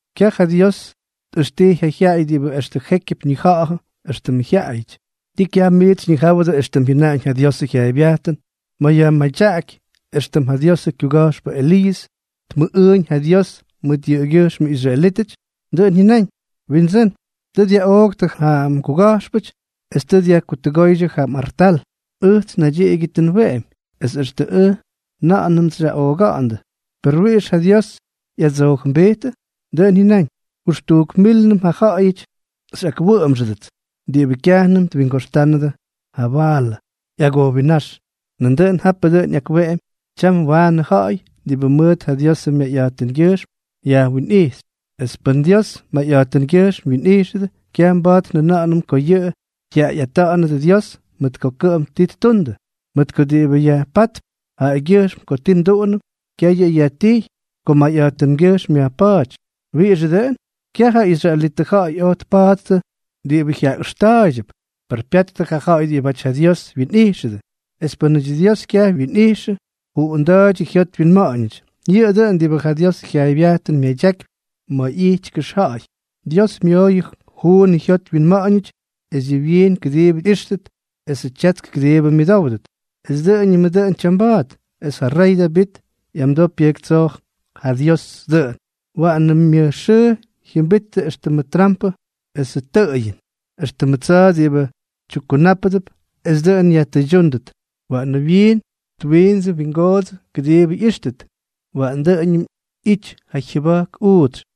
Kyaj ja Dios tꞌʉxtij ja jyaꞌay diꞌibʉ extʉ jékyʉp ñijawʉ éxtʉmʉ jyaꞌayʉty. ¿Tii kyaj miits xyñijáwʉdʉ éxtʉm jyʉnaꞌañ ja Diosʉ jyaaybyajtʉn ma̱ yajmadyaꞌaky éxtʉm ja Diosʉ kyuga̱jxpʉ Eliiʉs tmʉꞌꞌʉꞌʉñ ja Dios mʉt yʉꞌʉgyʉjxmʉ israelítʉty? Dʉꞌʉn jyʉnáñ: “Windsʉ́n, tʉ dyaꞌooktʉ ja mguga̱jxpʉty es tʉ dyajkutʉgóydyʉ yʉ mꞌartal; ʉjts naydyiꞌigyʉ tʉ nweꞌemy, es extʉ ʉj nandʉꞌʉnʉts xyaꞌooga̱ꞌa̱ndʉ.” ¿Per wiꞌix ja Dios ꞌyadsoojʉmbijtʉ? Dʉꞌʉn jyʉnáñ: “Jʉxtujk mílnʉm ja ja̱ꞌa̱yʉty xyꞌakwʉꞌʉmxʉdʉts diꞌibʉ kyajnʉm twingoxtánʉdʉ ja Baalʉ ꞌyagojwinnáx.” Nandʉꞌʉn ja̱jtpʉ dʉꞌʉn ꞌyakweꞌemy tyam waanʉ ja ja̱ꞌa̱y diꞌibʉ mʉt ja Diosʉ myayꞌa̱jtʉngyʉjxm yajwinꞌijxy. Es pʉn Dios mayꞌa̱jtʉngyʉjxm wyinꞌijxʉdʉ, kyaj mba̱a̱t njʉna̱ꞌa̱nʉm ko yʉꞌʉ jyaꞌayꞌátʉdʉ Dios mʉt ko kʉꞌʉm ti ttundʉ. Mʉt ko diꞌibʉ yajpátp jaꞌagyʉjxm ko ti nduꞌunʉm, kyaj yʉꞌʉ yajtijy ko mayꞌa̱jtʉngyʉjxm yajpa̱a̱ty. ¿Wiꞌixʉ dʉꞌʉn? Kyaj ja israelitʉ ja̱ꞌa̱y oj tpa̱a̱ttʉ diꞌibʉ jyaꞌʉxta̱a̱ydyʉp, per pyattʉ ja ja̱ꞌa̱y diꞌibáty ja Dios wyinꞌijxʉdʉ. Es pʉnaty Dios kyaj wyinꞌijxyʉ, juꞌunda̱a̱ydyʉ jyot wyinma̱ꞌa̱ñʉty. Yʉꞌʉ dʉꞌʉn diꞌibʉ ja Diosʉ jyaaybyajtʉn myadyakypy ma̱ ꞌyity kʉxja̱ꞌa̱y: “Dios myooyʉ juun jyot wyinma̱ꞌa̱ñʉty es yʉ wyiin kʉdiibʉ ꞌyíxtʉt esʉ tyatsk kʉdiibʉ myʉdówdʉt. Es dʉꞌʉñʉmʉ dʉꞌʉn tyamba̱a̱t.” Es ja rey Davit ꞌyamdoo pyʉjktsoo ja Dios dʉꞌʉn: Waꞌan ja myʉj xʉʉ jyʉmbitʉ éxtʉmʉ trampʉ esʉ tʉꞌʉyʉn, éxtʉmʉ tsa̱a̱ diꞌibʉ tyukkunápʉdʉp esʉ dʉꞌʉn yajtʉydyúndʉt. Waꞌanʉ wyiin twindsuꞌu twingoodsʉ kʉdiibʉ ꞌyíxtʉt; waꞌan dʉꞌʉñʉm ꞌyity ja jyʉba̱jk uutsy.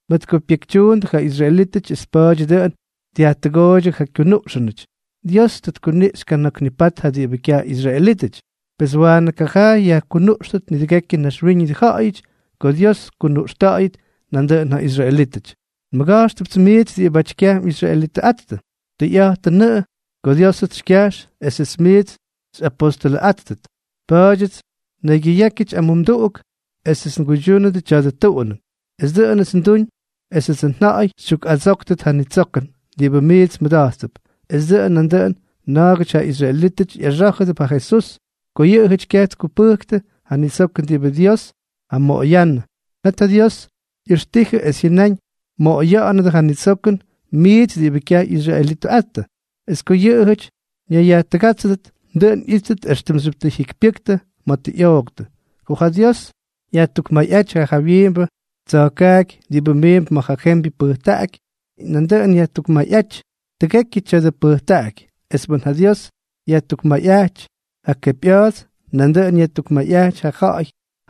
Mʉt ko pyekytyuundʉ ja israelítʉty es pa̱a̱dyʉ dʉꞌʉn dyajtʉgooydyʉ ja kyunuꞌxʉnʉty, Dios tʉ tkuniꞌxy kana̱k nipat ja diꞌibʉ kyaj ꞌyisraelítʉty. Pes waanʉ kajaa yajkunuꞌxtʉt nidʉgekyʉ naxwíñʉdʉ ja̱ꞌa̱yʉty ko Dios tkunuꞌxta̱ꞌa̱yʉt nandʉꞌʉn ja israelítʉty. Nmʉga̱jxtʉpts miits diꞌibáty kyaj mꞌisraelitʉꞌattʉ. Tʉyꞌa̱jtʉnʉꞌʉ ko Diósʉts xykyajx esʉts miits xyꞌapóstʉlʉꞌáttʉt. Pa̱a̱dyʉts nnaygyʉyákyʉty amumduꞌuk esʉts nguydyúnʉt tya̱dʉ tuꞌunʉn. Es dʉꞌʉnʉts nduñ esʉdsʉ nja̱ꞌa̱y xytyukꞌadsóktʉt ja nitsokʉn diꞌibʉ miits mmʉda̱jttʉp, es dʉꞌʉn nandʉꞌʉn na̱a̱gʉty ja israelítʉty ꞌyaxá̱jʉdʉp ja Jesús. Ko yʉꞌʉjʉty kyaj tkupʉjktʉ ja nitsokʉn diꞌibʉ Dios jamoꞌoyánʉ, net ja Dios ꞌyʉxtijʉ es jyʉnáñ mmoꞌoya̱ꞌa̱nʉdʉ ja nitsokʉn miits diꞌibʉ kyaj ꞌyisraelitʉꞌattʉ. Es ko yʉꞌʉjʉty ñayyajtʉgátsʉdʉt, dʉꞌʉn ꞌyítʉt éxtʉmxyʉp tʉ jyikypyʉktʉ ma̱ tʉ ꞌyooktʉ. Ko ja Dios yajtukmayꞌáty ja jawyiimbʉ tsa̱jkaaky diꞌibʉ miimp ma̱ ja jembyʉ pʉjtaꞌaky, nandʉꞌʉn yajtukmayꞌáty tʉgekyʉ tya̱dʉ pʉjtaꞌaky. Es pʉn ja Dios yajtukmayꞌáty ja kepyꞌa̱a̱ts, nandʉꞌʉn yajtukmayꞌáty ja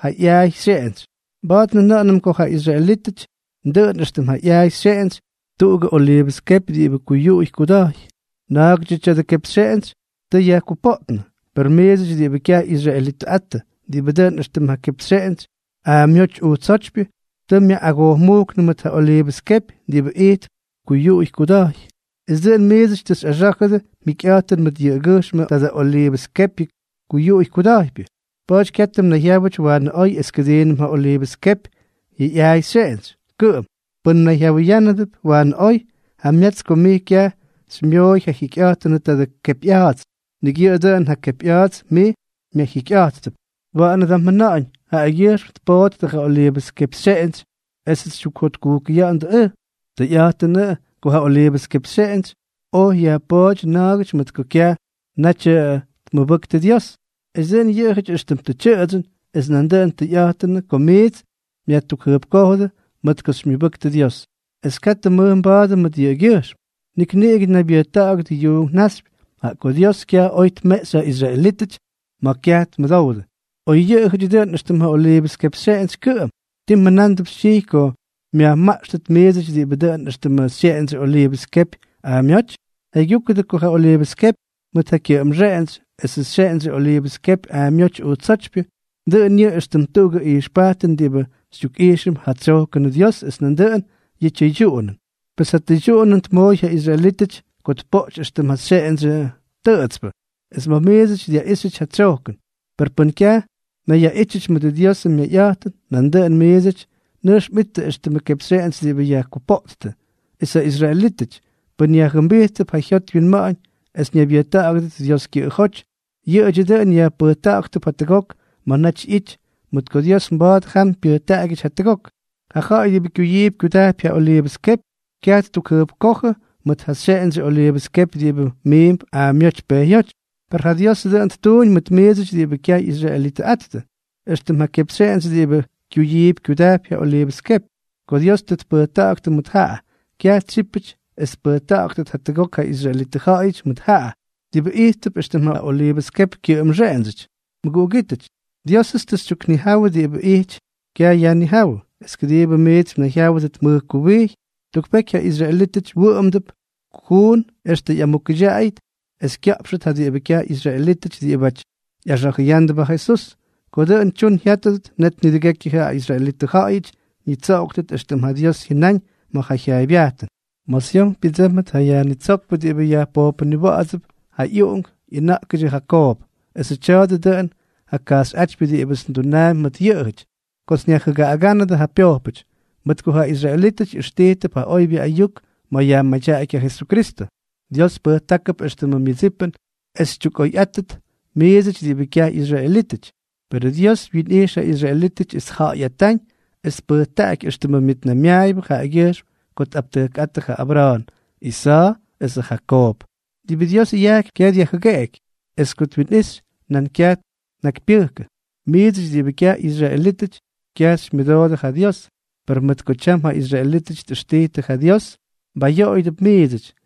ꞌyaay xyeꞌentsy. Mba̱a̱t njʉna̱ꞌa̱nʉm ko ja israelítʉty dʉꞌʉn éxtʉm ja ꞌyaay xyeꞌentsy tuꞌugʉ oliivʉs kepy diꞌibʉ kuyuꞌuy kuda̱jy. Na̱a̱gʉdyʉ tya̱dʉ kepxyeꞌentsy tʉ yajkupoottʉ. Pes miidsʉty diꞌibʉ kyaj ꞌyisraelitʉꞌattʉ, diꞌibʉ dʉꞌʉn éxtʉm ja kepxyeꞌentsy aamyóty ujtsótypyʉ, tʉ myaꞌꞌagojmúktʉ mʉt ja oliivʉs kepy diꞌibʉ ijtp kuyuꞌuy kuda̱jy, es dʉꞌʉn miidsʉty tʉ xyꞌaxá̱jʉdʉ mjikyꞌa̱jtʉn mʉt yʉꞌʉgyʉjxmʉ tadʉ oliivʉs kepyʉ kuyuꞌuy kuda̱jpyʉ. Pa̱a̱ty katʉ mnayjyáwʉty waanʉ oy es kʉdiinʉm ja oliivʉs kepyʉ ꞌyaay xyeꞌentsy kʉꞌʉm. Pʉn mnayjyawʉyánʉp waanʉ oy, jamyats ko mij kyaj xymyoꞌoy ja jikyꞌa̱jtʉnʉ tadʉ kepyꞌa̱a̱ts. Nik yʉꞌʉ dʉꞌʉn ja kepyꞌa̱a̱ts mij myajjikyꞌa̱jtʉp. Waꞌanʉ da mjʉna̱ꞌa̱ñ: “Jaꞌagyʉjxm tpoꞌttʉ ja oliivʉs kepxyeꞌentsy esʉts xytyukjʉjpkojʉya̱ꞌa̱ndʉ ʉj.” Tʉyꞌa̱jtʉnʉꞌʉ ko ja oliivʉs kepxyeꞌentsy oj yajpooty na̱a̱gʉty mʉt ko kyaj naty tmʉbʉktʉ Dios, es dʉꞌʉn yʉꞌʉjʉty éxtʉm tʉ tyʉꞌʉdsyʉn. Es nandʉꞌʉn tʉyꞌa̱jtʉnʉꞌʉ ko miits myajtukjʉjpkójʉdʉ mʉt ko xymyʉbʉktʉ Dios. Es katʉ mmʉj mba̱a̱dʉ mʉt yʉꞌʉgyʉjxm. Nik niꞌigʉ naybyʉjta̱ꞌa̱gʉdʉ yuunk naxypy. Jaꞌa ko Dios kyaj oj tmeꞌxy ja israelítʉty ma̱ kyaj tmʉdowdʉ, oy yʉꞌʉjʉty dʉꞌʉn éxtʉm ja oliivʉs kepxyeꞌentsy kʉꞌʉm, ¿tii mjʉna̱a̱mp xytyijy ko myajmaꞌxtʉt miidsʉty diꞌibʉ dʉꞌʉn éxtʉmʉ xyeꞌendsyʉ oliivʉs kepy aamyóty? Jaygyúkʉdʉ ko ja oliivʉs kepy mʉt ja kyʉꞌʉmxeꞌentsy esʉ xyeꞌendsyʉ oliivʉs kepy aamyóty ujtsótypyʉ, dʉꞌʉn yʉꞌʉ éxtʉm tuꞌugʉ ijxpajtʉn diꞌibʉ xytyukꞌijxʉm ja tsyojkʉnʉ Dios es nandʉꞌʉn yʉ tyʉydyuꞌunʉn. Pes ja tʉydyuꞌunʉn tmooy ja israelítʉty ko tpoꞌty éxtʉm ja xyeꞌendsyʉ tʉꞌʉtspʉ, es ma̱ miidsʉty dyaꞌíxyʉty ja tsyojkʉn. Per pʉn kyaj mnayyaꞌítyʉty mʉdʉ Diosʉ myayꞌa̱jtʉn, nandʉꞌʉn miidsʉty nʉjx mꞌittʉ éxtʉmʉ kepxyeꞌentsy diꞌibʉ yajkupoꞌttʉ. Es ja israelítʉty, pʉn yajjʉmbijttʉp ja jyot wyinma̱ꞌa̱ñ es ñaybyʉjta̱ꞌa̱gʉdʉt Dios kyʉꞌʉjóty, yʉꞌʉdyʉ dʉꞌʉn yajpʉjta̱ꞌa̱ktʉp jatʉgok ma̱ naty ꞌyity, mʉt ko Dios mba̱a̱t jam pyʉjtaꞌagyʉty jatʉgok. Ja ja̱ꞌa̱y diꞌibʉ kyuyiipy kyudajpy ja oliivʉs kepy, kyaj ttukjʉjpkójʉ mʉt ja xyeꞌendsyʉ oliivʉs kepy diꞌibʉ miimp aamyóty pejyóty. Per ja Diosʉ dʉꞌʉn ttuuñ mʉt miidsʉty diꞌibʉ kyaj ꞌyisraelitʉꞌattʉ, éxtʉm ja kepxyeꞌentsy diꞌibʉ kyuyiipy kyudajpy ja oliivʉs kepy. Ko Dios tʉ mbʉjkta̱ꞌa̱gʉdʉ mʉt jaꞌa, kyaj tsyípʉty es tpʉjkta̱ꞌa̱gʉt jatʉgok ja israelitʉ ja̱ꞌa̱yʉty mʉt jaꞌa, diꞌibʉ ijttʉp éxtʉm ja oliivʉs kepy kyʉꞌʉmxeꞌendsyʉty. Mʉguꞌugítʉty, Diósʉts tʉ xytyuknijawʉ diꞌibʉ ijty kyayajnijáwʉ, es kʉdiibʉ miits mnayjyáwʉdʉt mʉj kuwijy. Tuk peky ja israelítʉty wʉꞌʉmdʉp kujuun extʉ ꞌyamukʉdyaꞌaydyʉt es kya̱ꞌpxʉt ja diꞌibʉ kyaj ꞌyisraelítʉty diꞌibáty ꞌyaxa̱jʉyándʉp ja Jesús. Ko dʉꞌʉn tyun jyátʉdʉt, net nidʉgekyʉ ja israelitʉ ja̱ꞌa̱yʉty ñitsoꞌoktʉt, éxtʉm ja Dios jyʉnaꞌañ ma̱ ja jyaaybyajtʉn: Ma̱ Syon pyʉdsʉ́mʉt ja Yajnitsókpʉ diꞌibʉ yajpojpʉniwa̱ꞌa̱dsʉp ja ꞌyuꞌunk ꞌyʉna̱ꞌkʉdyʉ Jakoob. Esʉ tya̱a̱dʉ dʉꞌʉn ja kajxyꞌátypyʉ diꞌibʉts ndunaampy mʉt yʉꞌʉjʉty kots nyajjʉgaꞌagánʉdʉ ja pyojpʉty. Mʉt ko ja israelítʉty ꞌyʉxtijtʉp ja oybyʉ ayuk ma̱ yajmadyaꞌaky ja Jesukristʉ, Dios pʉjtákʉp éxtʉmʉ myʉdsipʉn es xytyukꞌoyꞌáttʉt miidsʉty diꞌibʉ kyaj ꞌyisraelítʉty. Perʉ Dios wyinꞌijx ja israelítʉty es tja̱ꞌa̱yꞌata̱ꞌa̱ñ es tpʉjtaꞌaky éxtʉmʉ myʉtnaymyaayʉbʉ jaꞌagyʉjxm ko tꞌaptʉjkꞌáttʉ ja Abra̱a̱n, Isa̱a̱ esʉ Jakoob. Diꞌibʉ Dios yajkypy, kyaj dyajjʉgeꞌeky; es ko twinꞌixy, nan kyaj tnakypyʉjkʉ. Miidsʉty diꞌibʉ kyaj ꞌyisraelítʉty, kyaj xymyʉmʉdoodʉ ja Dios, per mʉt ko tyam ja israelítʉty tꞌʉxtijtʉ ja Dios, mbaꞌꞌayoojʉdʉp miidsʉty.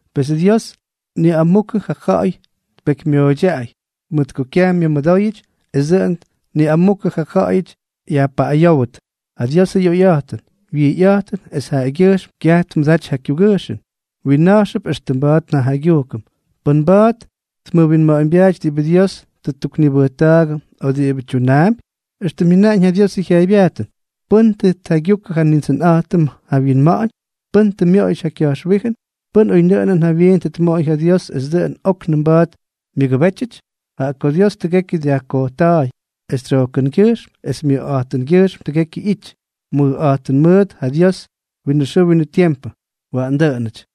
Pes Dios niꞌamukʉ ja ja̱ꞌa̱y tpekymyoꞌoydyaꞌay mʉt ko kyaj myʉmʉdóyʉty, es dʉꞌʉn niꞌamukʉ ja ja̱ꞌa̱yʉty yajpaꞌꞌayówdʉt. ¡Ja Diosʉ ꞌyoyꞌa̱jtʉn, wyijyꞌa̱jtʉn esʉ jyaygyujkʉn kyaj tmʉdaty ja kyugʉjxʉn, wyinna̱jxnʉp éxtʉm mba̱a̱t njajaygyujkʉm! ¿Pʉ́n mba̱a̱t tmʉwinma̱ꞌa̱ñbyaaty diꞌibʉ Dios tʉ ttuknibʉjta̱a̱gʉ o diꞌibʉ tyunaampy? Extʉm jyʉnaꞌañ ja Diosʉ jyaaybyajtʉn: “¿Pʉ́n tʉ tjaygyukʉ ja Nindsʉnꞌa̱jtʉm ja wyinma̱ꞌa̱ñ?, ¿pʉ́n tʉ myoꞌoyʉty ja ka̱jxwíjʉn? ¿Pʉ́n oynʉꞌʉnʉn jawyiin tʉ tmoꞌoy ja Dios es dʉꞌʉn óknʉm mba̱a̱t myʉgʉbétyʉty?” Jaꞌa ko Dios tʉgekyʉ dyajkojta̱a̱y, es tsyojkʉngyʉjxm es myʉjꞌa̱jtʉngyʉjxm tʉgekyʉ ꞌyity. ¡Mʉjꞌa̱jtʉn mʉʉt ja Dios winʉ xʉʉ winʉ tiempʉ! Waꞌan dʉꞌʉnʉty.